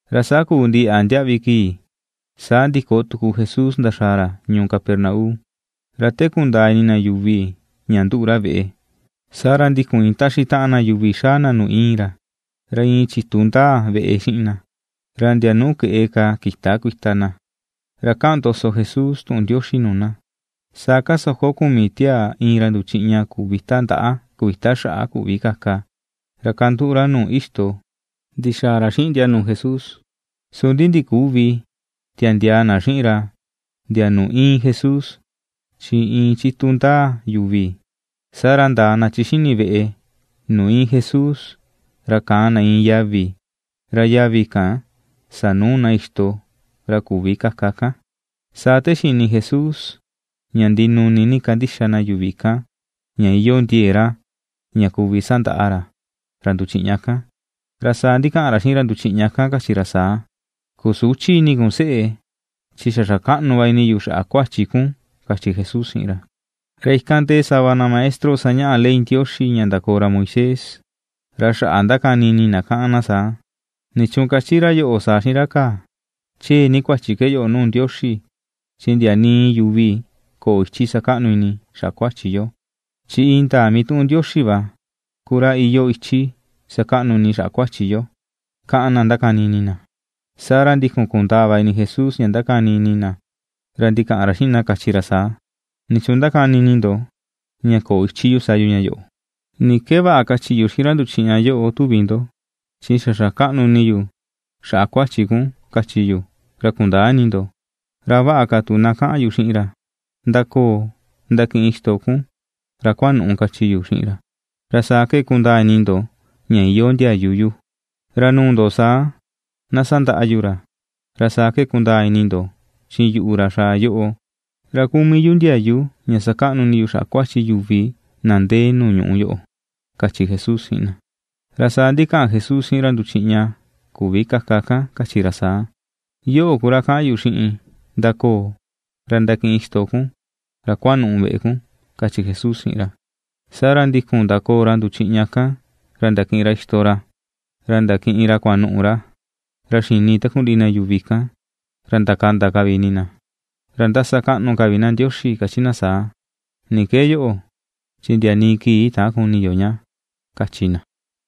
Ra saa kuu ndiyaꞌa ndiaꞌvi kii, saa ndiko tuku Jesús ndaxàà ra ñuu Capernaum. Ra te kundaa ini na yuvi ña ndúꞌu̱ ra veꞌe saa ra ndikun iin taxi taꞌan na yuvi xaa na nuu íin ra. Ra iin chitu ndaa veꞌe xiꞌin na, ra ndia nuu keꞌe ka kïta kuita na; ra kaꞌan ndoso Jesús tuꞌun Ndioxi nuu na. Saa kasoko kumi tiaa iin ra nduchiꞌña kuvita ndaꞌa, kuvita xaꞌa, küvi kaka, ra kanduꞌu ra nuu ixto ndixaa ra xiꞌin ndia nuu Jesús. Su ndi ndiküvi tiandiaa na xiꞌin ra ndia nuu íin Jesús, chi iin chitu ndaa yuvi, saa ra ndaa na chi xi̱ni̱ veꞌe nuu íin Jesús, ra kaan na iin yavi, ra yavi kan sanuu na ixto ra küvi kaka kan. Saa te xini Jesús ña ndinuni ni kandixa na yuvi kan ña iyoo ndie̱e̱ ra ña kuvi sandaꞌa ra, ra nduchiꞌña kan, ra saa ndikaꞌan ra xiꞌin ra nduchiꞌña kan kachi ra saa: ―Seꞌe, xa xakaꞌnu va ini yu xaꞌa kuachi kun ―kachi Jesús xiꞌin ra. Ra ikan ndee sava na maestro sañaꞌa ley Ndioxi ña ndakoo ra Moisés, ra xaꞌa ndakani ini na kaꞌan na saa: “¿Nichuun kachi ra yoꞌo saa xiꞌin ra kaa? Chee ni kuachi ke yoꞌo nuu Ndioxi chi ndia nii yuvi köo ichi sakaꞌnu ini xaꞌa kuachi yo, chi indaa mituꞌun Ndioxi va ku ra iyoo ichi sakaꞌnu ini xaꞌa kuachi yo”, kaꞌan na ndakani ini na. Saa ra ndikun kundaa va ini Jesús ña ndakani ini na, ra ndikaꞌan ra xiꞌin na kachi ra saa: ―¿Nichuun ndakani ini ndo ña köo ichi yu sa yu ña yoꞌo? ¿Ni ke vaꞌa kachi yu xiꞌin ra nduchiꞌña yoꞌo, tuvi ndo? Chi “xa xakaꞌnu ini yu xaꞌa kuachi kun”, kachi yu, ra kundäa ini ndo. Ra a vaꞌa ka tu na kaꞌan yu xiꞌin ra: “Ndakoò ndakiꞌin ixto kun ra kuanu̱ꞌu̱”, kachi yu xiꞌin ra. Ra saa ke kundaa ini ndo ña iyoo ndiayu yu. Ra nuu ndo saa, na sandaꞌa yu ra, ra saa ke na kundaa ini ndo, chi yuꞌu, ra xaa yoꞌo, ra kuu mii yu ndiayu ña sakaꞌnu ini yu xaꞌa kuachi yuvi na ndee nuu ñuꞌu yoꞌo ―kachi Jesús xiꞌin na. Ra saa ndikaꞌan Jesús xiꞌin ra nduchiꞌña küvi kaka kan, kachi ra saa: ―Yoꞌo ku ra kaꞌan yu xiꞌin: ndakoo, ra ndakiꞌin ixto kun, ra kuanuꞌu veꞌe kun ―kachi Jesús xiꞌin ra. Saa ra ndikun ndakoò ra nduchiꞌña kan ra ndakiꞌin ra ixto ra, ra ndakiꞌin ra kuanuꞌu ra, ra xini takundiꞌi na yuvi kan. Ra ndakanda ka vi ini na, ra ndasakaꞌnu ka vi na Ndioxi kachi na saa: ―¿Ni ke yoꞌo? chi ndia nii kii täan kuni yo ña ―kachi na.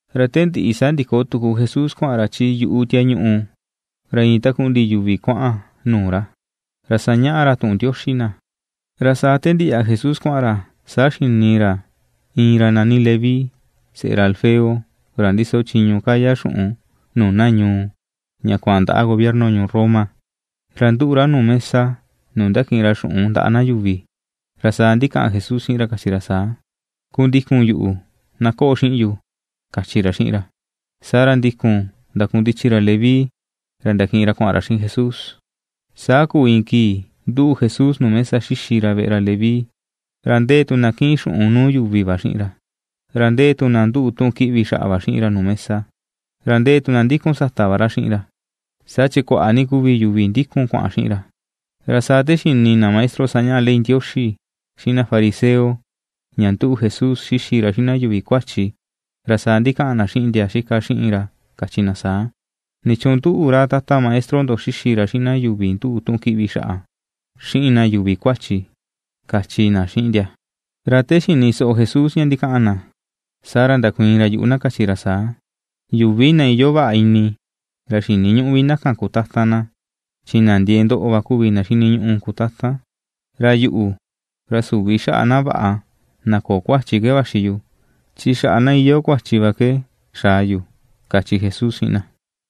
Ra te ndiꞌi saa ndiko tuku Jesús kuaꞌan ra chi yuꞌu tiañuꞌu. Ra iin takundiꞌi yuvi kuaꞌan nuu ra, ra sañaꞌa ra tuꞌun Ndioxi na. Ra saa te ndiyaꞌa Jesús kuaꞌan ra, saa xini ra iin ra nani Leví, seꞌe ra Alfeo, ra ndiso chiñu kaya xuꞌun nuu na ñuu ña kuaꞌan ndaꞌa gobierno ñuu Roma. Ra ^nduꞌu ra nuu mesa nuu ndakiꞌin ra xuꞌun ndaꞌa na yuvi, ra saa ndikaꞌan Jesús xiꞌin ra kachi ra saa: ―Kundikun yuꞌu. Na koꞌo xiꞌin yu ―kachi ra xiꞌin ra. Saa ra ndikun ndakundichi ra Leví ra ndakiꞌin ra kuaꞌan ra xiꞌin Jesús. Saa kuu iin kii ^nduꞌu Jesús nuu mesa xixi ra veꞌe ra Leví. Ra ndee tu na kiꞌin xuꞌun nuu yuvi va xiꞌin ra, ra ndee tu na ^nduꞌu tuꞌun kiꞌvi xaꞌa va xiꞌin ra nuu mesa, ra ndee tu na ndikun sata va ra xiꞌin ra, saa chi kuaꞌa ni kuvi yuvi ndikun kuaꞌan xiꞌin ra. Ra saa te xini na maestro sañaꞌa ley Ndioxi, xiꞌin na fariseo, ña ^nduꞌu Jesús xixi ra xiꞌin na yuvi kuachi, ra saa ndikaꞌan na xiꞌin ndia xitaꞌan xiꞌin ra kachi na saa: ―¿Nichuun nduꞌu ra tata maestro ndo xixi ra xiꞌin na yuvi nduꞌu tuꞌun kiꞌvi xaꞌa, xiꞌin na yuvi kuachi, ―kachi na xiꞌin ndia. Ra ta xini soꞌo Jesús ña ndikaꞌan na, saa ra ndakuiin ra yuꞌu na kachi ra saa: ―Yuvi na iyoo vaꞌa ini ra xiniñüꞌu vi na kan kutatan na, chi na ndiee ndoꞌo va kuvi na xiniñuꞌu kutatan. Ra yuꞌu, ra süvi xaꞌa na vaꞌa, na köo kuachi ke vaxi yu, chi xaꞌa na iyoo kuachi va ke xaa yu ―kachi Jesús xiꞌin na.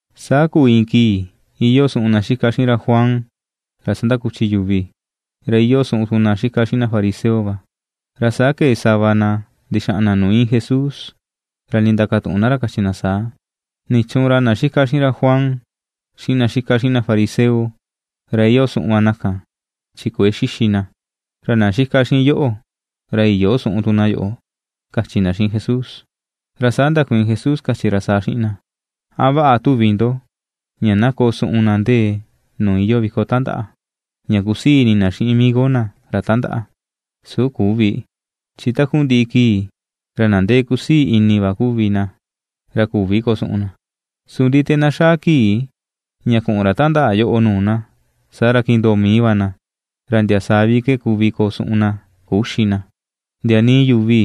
Saa kuu iin kii iyoo suꞌun ndia itaꞌan xiꞌin ra Juan, ra sandakuchi yuvi, ra iyoo suꞌun tu na itaꞌan xiꞌin na fariseo va, ra saa kee sava na ndixaꞌan na nuu iin Jesús ra ndindakatuꞌun na ra kachi na saa: ―¿Nichuun ra ndia itaꞌan xiꞌin ra Juan, xiꞌin ndia itaꞌan xiꞌin na fariseo, ra iyoo suꞌun va na kan, chin kuëe xixi ndia, ra ndia itaꞌan xiꞌin yoꞌo, ra iyöo suꞌun tu na yoꞌo? ―kachi na xiꞌin Jesús. Ra saa ndakuiin Jesús kachi ra saa xiꞌin ndia: ―¿A vaꞌa tu na koo suꞌun na ndee nuu iyoo viko tandaꞌa, tuvi ndo, ña ndee na kusii ini na xiꞌin migo na ra tandaꞌa? Su küvi, chi ta iin ka va ra, ra takundiꞌi kii ra na ndee kusii ini va kuvi na, ra küvi koo suꞌun na, ña küxi na. Ndi su te na xaa kii ña kuꞌun ra tandaꞌa kan nuu na, saa ra kindoo mii va na, ra ndia saa vi ke kuvi koo suꞌun na, küxi na. ’Ndia nii yuvi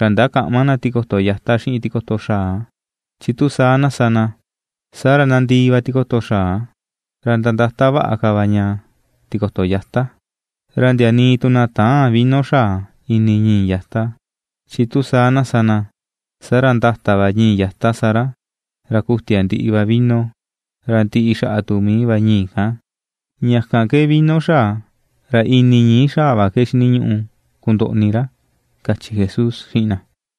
ra ndakäꞌma na tikoto yata xiꞌin tikoto xaa, chi tu saa na sa na, saa ra nandii va tikoto xaa, ra ndandata vaꞌa ka va ña tikoto yata. Ra ndia nii tu na täân vino xaa ini ñii̱ yata, chi tu saa na sa na, saa ra ndata va ñii̱ yata sa ra, ra ku̱tia ndiꞌi va vino, ra ndiꞌi xaꞌa tu mii va ñii̱ kan, ña kan ke vino xaa, ra ini ñii̱ xaa va ke xiniñuꞌu kundoꞌni ra ―kachi Jesús xiꞌin na.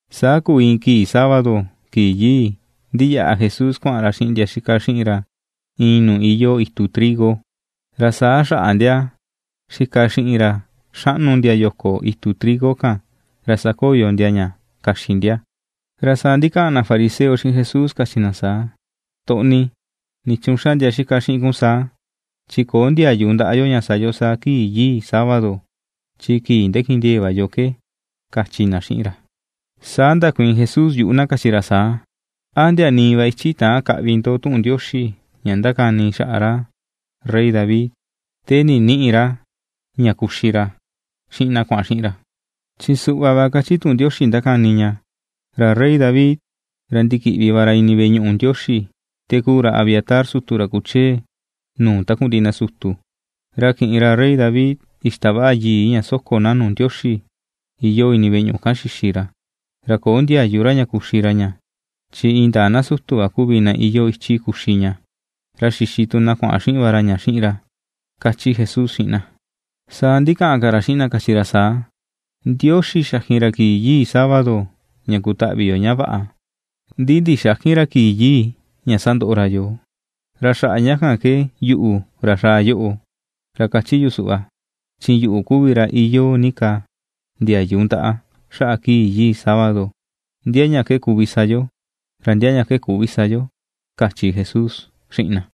Saa kuu iin kii sábado, kii yii, ndiyaꞌa Jesús kuaꞌan ra xiꞌin ndia itaꞌan xiꞌin ra iin nuu iyoo itu trigo, ra saa xaꞌa ndia xika xiꞌin ra xaꞌnu ndia yo̱ko̱ itu trigo kan ra sakoyo ndia ña kaxi ndia. Ra saa, ndikaꞌan na fariseo xiꞌin Jesús kachi na saa: ―Toꞌni, ¿nichuun xa ndia itaꞌan xiꞌin kun saa? Chi köo ndiayu ndaꞌa yo ña sa yo saa kii yii sábado, chi kii ndakindiee̱ va yo ke ―kachi na xiꞌin ra. Saa ndakuiin Jesús yuꞌu na kachi ra saa: ¿A ndia nii va ichi täan kaꞌvi ndo tuꞌun Ndioxi ña ndakani xaꞌa ra Rey David, te ninïꞌi ra ña kuxi ra xiꞌin na kuaꞌan xiꞌin ra? Chi suꞌva va ke kachi tuꞌun Ndioxi ndakani ña: “Ra Rey David, ra ndikiꞌvi va ra ini veꞌe ñuꞌu Ndioxi, te kuu ra Abiatar sutu ra kuchee nuu takundiꞌi na sutu, ra kiꞌin ra Rey David ixtavaꞌa yii ña soko na nuu Ndioxi iyoo ini veꞌe ñuꞌu kan xixi ra, ra köo ndiayu ra ña kuxi ra ña, chi indaa na sutu va kuvi na iyoo ichi kuxi ña, ra xixi tu na kuaꞌan xiꞌin va ra ña xiꞌin ra”, ―kachi Jesús xiꞌin na. Saa ndikaꞌan ka ra xiꞌin na kachi ra saa: ―Ndioxi xakin ra kii yii sábado, ña kutaꞌvi yo ña vaꞌa; ndi ndixäkin ra kii yii ña sandoꞌo ra yoo. Ra xaꞌa ña kan ke yuꞌu, ra xaa yoꞌo, ra kachi yu suꞌva: chi yuꞌu kuvi ra iyoo ni ka ndiayu ndaꞌa xaꞌa kii yii sábado, ndia ña ke kuvi sa yo, ra ndia ña ke küvi sa yo ―kachi Jesús xiꞌin na.